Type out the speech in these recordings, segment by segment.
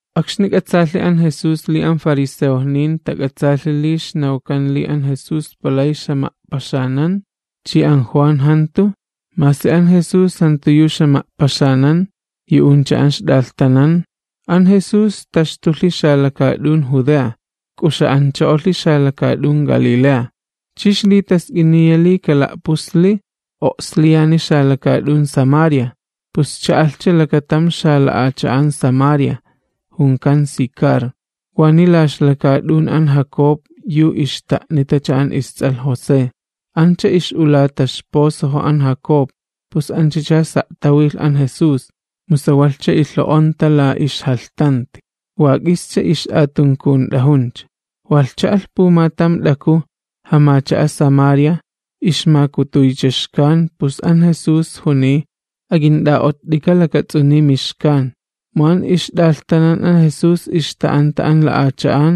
Akxni k'atsaalhi an Jesús li an fariseojnin tak'atsaalhi li ixnawkan li an Jesús palay ixjama'paxanan chi an Juan jantu, masi an Jesús jantu yu ixjama'paxanan, yu'uncha an ixt'alhtanan, an Jesús taxtulhi xalakaat'un Judea k'uxa'ancho'olhi xalakaat'un Galilea. Chi ixlitask'iniya li kala'pusli o'sliyani xalakaat'un Samaria. Pus cha'alhcha lakatam xala'acha'an Samaria, junkan Sicar, waniy la ixlakaat'un an Jacob yu ixta'nitacha an ists'alh José. Ancha ix'ulata ixpozojo an Jacob, pus anchacha sa' tawilh an Jesús, mu sawalhcha ilho'onta la ixjalhtanti, wa k'ischa ix'atunkunt'ajuncha. Walh cha'alh pumatam t'aku, jamacha'a Samaria, ixmakutuycha xkan, pus an Jesús juniy: ―Ak'int'a'ott'ika lakats'uniy mixkan. Mu an ixt'alhtanan an Jesús ixta'anta an la'acha'an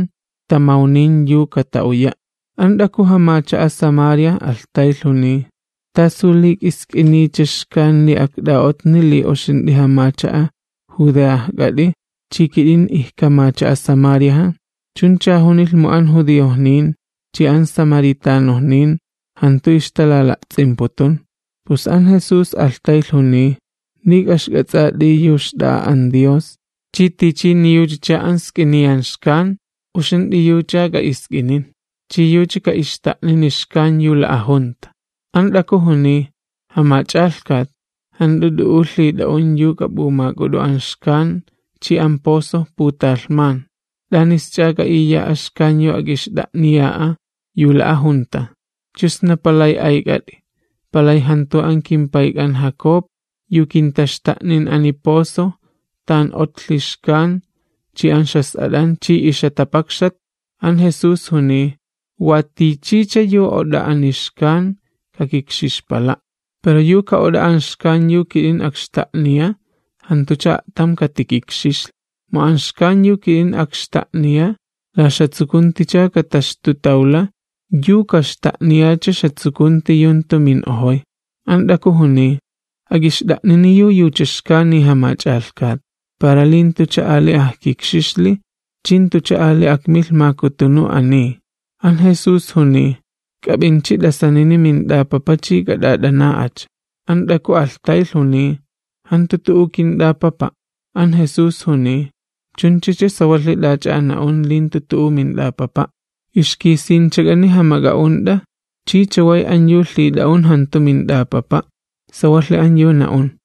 tamawnin yu kata'uya'. An t'aku, jamacha'a Samaria alhtaylh, juniy: ―¿Tasu li k'isk'iniycha xkan li akt'a'otni li uxint'i jamacha'a Judeajk'at'i chi kit'in ijkamacha'a Samariaja? Chuncha junilh mu an judiojnin chi an samaritanojnin jantu ixtalala'ts'imputum. Pus an Jesús alhtaylh juniy: ―Li k'a'ixk'ats'at'i yu xt'a'a an Dios, chi tichini yuchacha an sk'iniyan xkan, uxint'i yuch'a k'a'isk'inin, chi yucha ka'ixta'nini xkan yu la'ajunta. An t'aku juniy: ―Jamach'alhkat, jant'u t'u'u lhit'a'un yu k'ap'umak'ut'u an xkan, chi an pozo putalhman. ¿T'anisch'a k'a'iya'a xkan yu ak'ixt'a'niya'a yu la'ajunta? ¿Chu sna palay ayk'at'i, palay jantu an kimpayk'an Jacob yu kintaxta'nin ani pozo, tan otlhi xkan chi an ixjas'at'an chi ixjatapakxat? An Jesús juniy: ―Wa tichicha yu ot'a ani xkan kakikxixpala', pero yu ka'ot'a an xkan yu kit'in akxta'niya jantucha a'tam katikikxixli. Mu an xkan yu kit'in akxta'niya la ixjatsukunticha kataxtutawla yu kaxta'niyacha ixjatsukunti yu jantu min'ojoy. An t'aku juniy: ―Ak'ixt'a'nini yu yucha xkani Jamach'alhkat, para li jantucha ali ajkikxixli chi jantucha ali akmilh makutunu ani. An Jesús juniy: ―K'ap'inchi t'asanini mint'apapa chi k'at'at'ana'acha. An t'aku alhtaylh juniy: ―Jantu tu'u kint'apapa'. An Jesús juniy: ―Chunchacha sawalhi t'ach'a an na'un li jantu tu'u mint'apapa'. Ixkisinchak'ani jamak'a'unt'a chi chaway an yu lhit'a'un jantu mint'apapa'. Sawalhi an yu na'un.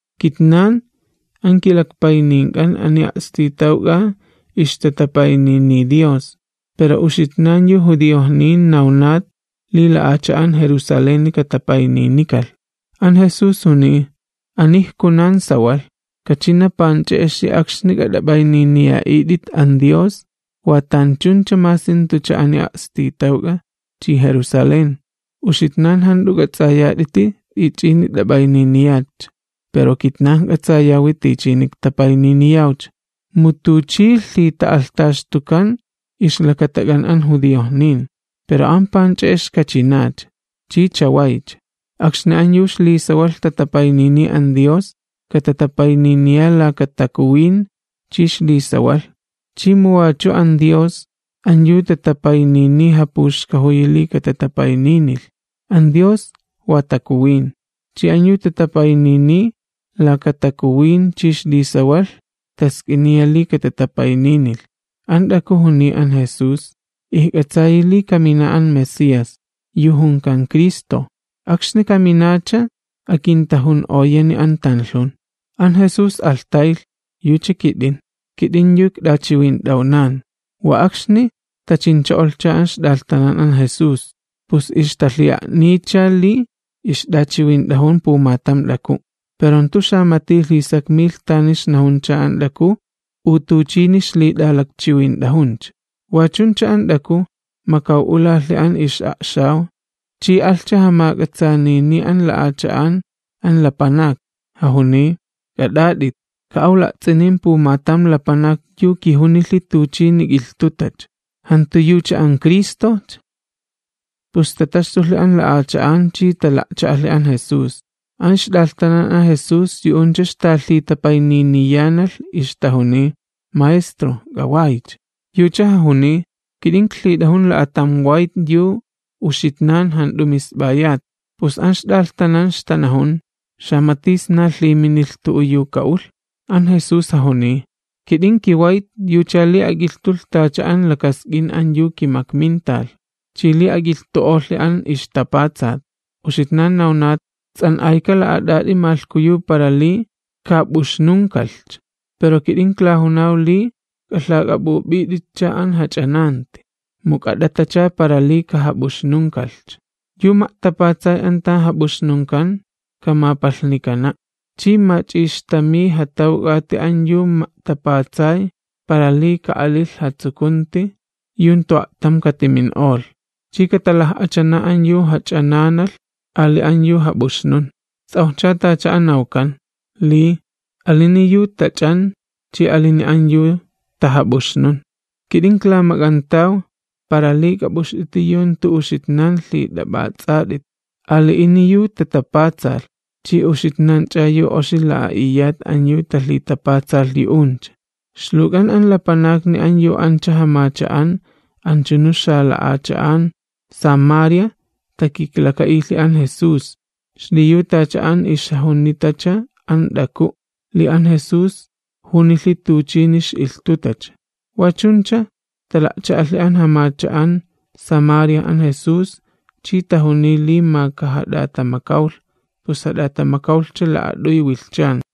Kitnan an kilakpaynink'an ani a'stitawk'a ixtatapayniniy Dios, pero uxitnan yu judiojnin nawnat li la'acha'an Jerusaleni katapayninikalh. An Jesús juniy: ―Ani ijkunan sawalh, kachina panch'e'ex akxni k'at'ap'ayniniya'it'it an Dios wa tanchuncha masi jantucha ani a'stitawk'a chi Jerusalén. Uxitnan jant'u k'ats'ayat'iti t'ich'ini t'ap'ayniniyatcha, pero kitnan ijk'atsayawi tichini iktapayniniyawcha, mu tuchi lhita'alhtaxtukan ixlakatak'an an judiojnin. Pero an panch'e'ex kachinacha, chi chawaycha, akxni an yu ixlisawalh tatapayniniy an Dios katatapayniniya laka takuwin chi ixlisawalh, chi mu wachu an Dios, an yu tatapayniniy japuxkajuyi li katatapayninilh. An Dios wa Takuwin, chi an yu tatapayniniy laka takuwin chi ixlisawalh task'iniya li katatapayninilh. An t'aku juniy an Jesús: ―Ijk'atsayi li kamina an Mesías, yu junkan Cristo. Akxni kaminacha akintajun'oyani an tanlhun. An Jesús alhtaylh: ―Yucha kit'in, kit'in yu ikt'achiwint'awnan. Wa akxni tachincho'olhcha an ixt'alhtanan an Jesús, pus ixtalhi'a'niycha li ixt'achiwint'ajun pumatam t'aku'. Pero jantu xamati lhisakmilh tani ixnajuncha an t'aku u tuchini ixlit'alakchiwint'ajuncha. Wa chuncha an t'aku makaw'ulalhi an ix'a'xaw, chi alhcha jamak'atsaanini an la'acha'an an lapanakni, jajuniy: ―K'at'at'it, ka'aw la'ts'inin pumatam lapanak yu kijunilhi tuchini k'ilhtutacha. ¿Jantu yucha an Cristojcha? Pus tataxtulhi an la'acha'an chi tala'cha'alhi an Jesús. An ixt'alhtanan an Jesús yu'uncha ixtalhitapayniniyanalh, ixtajuniy: ―Maestro, k'awaycha. Yucha jajuniy: ―Kit'in iklhit'ajun la'atam wayt yu uxitnan jant'u misp'ayat. Pus an ixt'alhtanan ixtanajun: ―¿Xamati amaj lhiminilh tu'u yu ka'ulh? An Jesús jajuniy: ―Kit'in kiwayt yucha li ak'ilhtulh tacha an lakask'in an yu kimakminta, chi li ak'ilhtu'olhi an ixtapatsat. Uxitnan nawnat: “Ts'an'ayka la'at'at'i malhkuyu para li kajap'uxnunkalhcha”. Pero kit'in iklajunaw li k'alhak'ap'up'it'itcha an jach'ananti, mu k'at'atacha para li kajap'uxnunkalhcha. Yu ma'tapatsay an tan jap'uxnunkan kamapalhnikana', chi mach'ixtamiy jatawk'ati an yu ma'tapatsay para li ka'alilh jatsukunti yu jantu a'tam katimin'olh, chi katalaj'achana an yu jach'ananalh ali an yu jap'uxnun. Ts'awjcha tacha an nawkan, li: “Ali'ini yu tach'an chi ali'ini an yu tajap'uxnun.” Kit'in iklamak'antaw para li k'ap'uxt'iti yu jantu uxitnan lhit'ap'ats'at'it, ali'ini yu tatapatsalh, chi uxitnanch'a yu oxi la'a'iyat an yu tala'tapatsalh yu'uncha. Ixluwk'an an lapanakni an yu ancha jamacha'an anchunu xala'acha'an Samaria takiklaka'ilhi an Jesús, xliyu tacha an ixjajunitacha an t'aku', li an Jesús junilhi tuchini ix'ilhtutacha. Wa chuncha tala'cha'alhi an jamacha'an Samaria an Jesús chi tajuniy li ma kajat'atamakawlh, pus jat'atamakawlhcha la'at'uy wilhchan.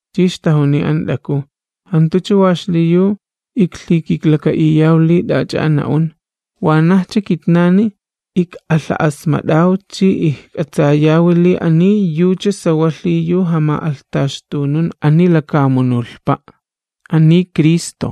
Chi ixtajuniy an t'aku: ―Jantucha wa xliyu iklhikiklaka'iyaw li t'ach'a an na'un, wanajcha kitnani ik'alha'asmat'aw chi ijk'atsayawi li ani yucha sawalhi yu jama'alhtaxtunun ani lakamunulhpa', ani Cristo.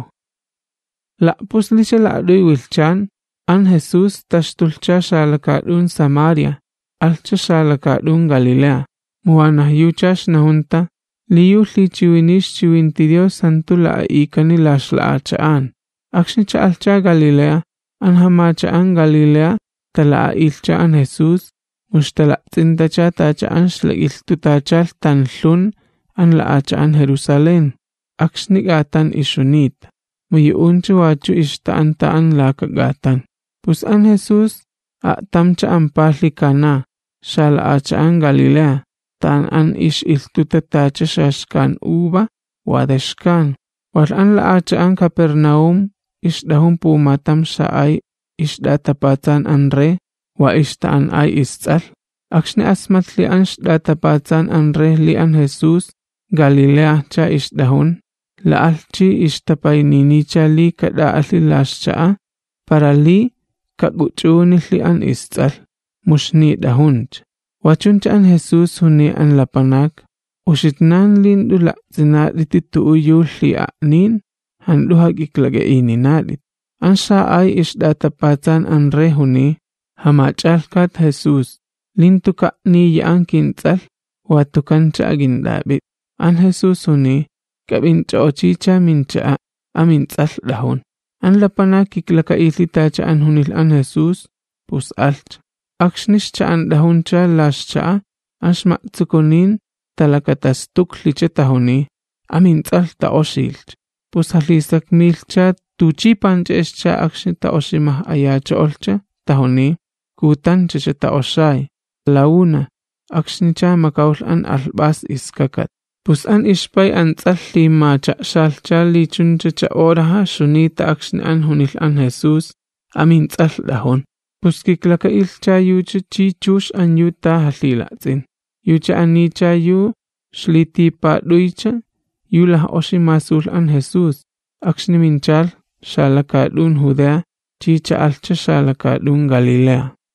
La'puslicha la'at'uy wilhchan, an Jesús taxtulhcha xalakaat'un Samaria, alhcha xalakaat'un Galilea. Mu wanaj yucha ixnajunta, li yu lhichiwiniy ixchiwinti Dios jantu la'a'ikani la ixlakaat'un. Akxni cha'alhcha Galilea, an jamacha'an Galilea tala'a'ilhcha an Jesús, mu ixtala'ts'intacha tacha an ixlak'ilhtutachalh tanlhun an la'acha'an Jerusalén, akxni k'atan ixjunita, mu yu'uncha wachu ixta'anta an laka k'atan. Pus an Jesús a'tamcha ampalhi Caná, xalakaat'un Galilea, tan an ix'ilhtuta tacha xaxkan uva yu wa xkan. Walh an la'acha'an Capernaúm ixt'ajun pumatam xa'ay ixt'atapatsan an rey, wa ixta'an'ay ists'alh. Akxni asmatlhi an ixt'atapatsan an rey li an Jesús Galileajcha ixt'ajun, la'alh chi ixtapayniniycha li kat'a'alhi la ixcha'a para li kak'uch'unilhi an ists'alh, mu ixnit'ajuncha. Wa chuncha an Jesús juniy an lapanak: ―Uxitnan li jant'u la'ts'inat'iti tu'u yu lhi'a'nin jant'u jak'iklak'a'ininat'it. An xa'ay ixt'atapatsan an rey juniy: ―Jamach'alhkat Jesús, li jantuka' niya an kints'alh watukancha ak'int'ap'it'i. An Jesús juniy: ―K'ap'inch'o'ochicha mincha'a', amints'alh t'ajun. An lapanak kiklaka'ilhi tacha an junilh an Jesús, pus alhcha. Akxni ixcha'ant'ajuncha la ixcha'a, an ixma'tsukunin talakatastuklhicha, tajuniy: ―Amints'alh ta'oxilhcha. Pus jalhisakmilhcha tuchi panch'e'excha akxni ta'oximaj'ayacho'olhcha. Tajuniy: ―Kutanchacha ta'oxay, la una, akxnicha makawlh an alhp'as iskakat. Pus an ixpay an ts'alh lhimacha'xalhcha li chunchacha horaja ixjunita akxni an junilh an Jesús: “Amints'alh t'ajun.” Pus kiklaka'ilhcha yucha chi chux an yu ta jalhila'ts'in. Yucha anicha yu ixlitipat'uycha yu laj'oxi masulh an Jesús, akxni minchalh xalakaat'un Judea chi cha'alhcha xalakaat'un Galilea.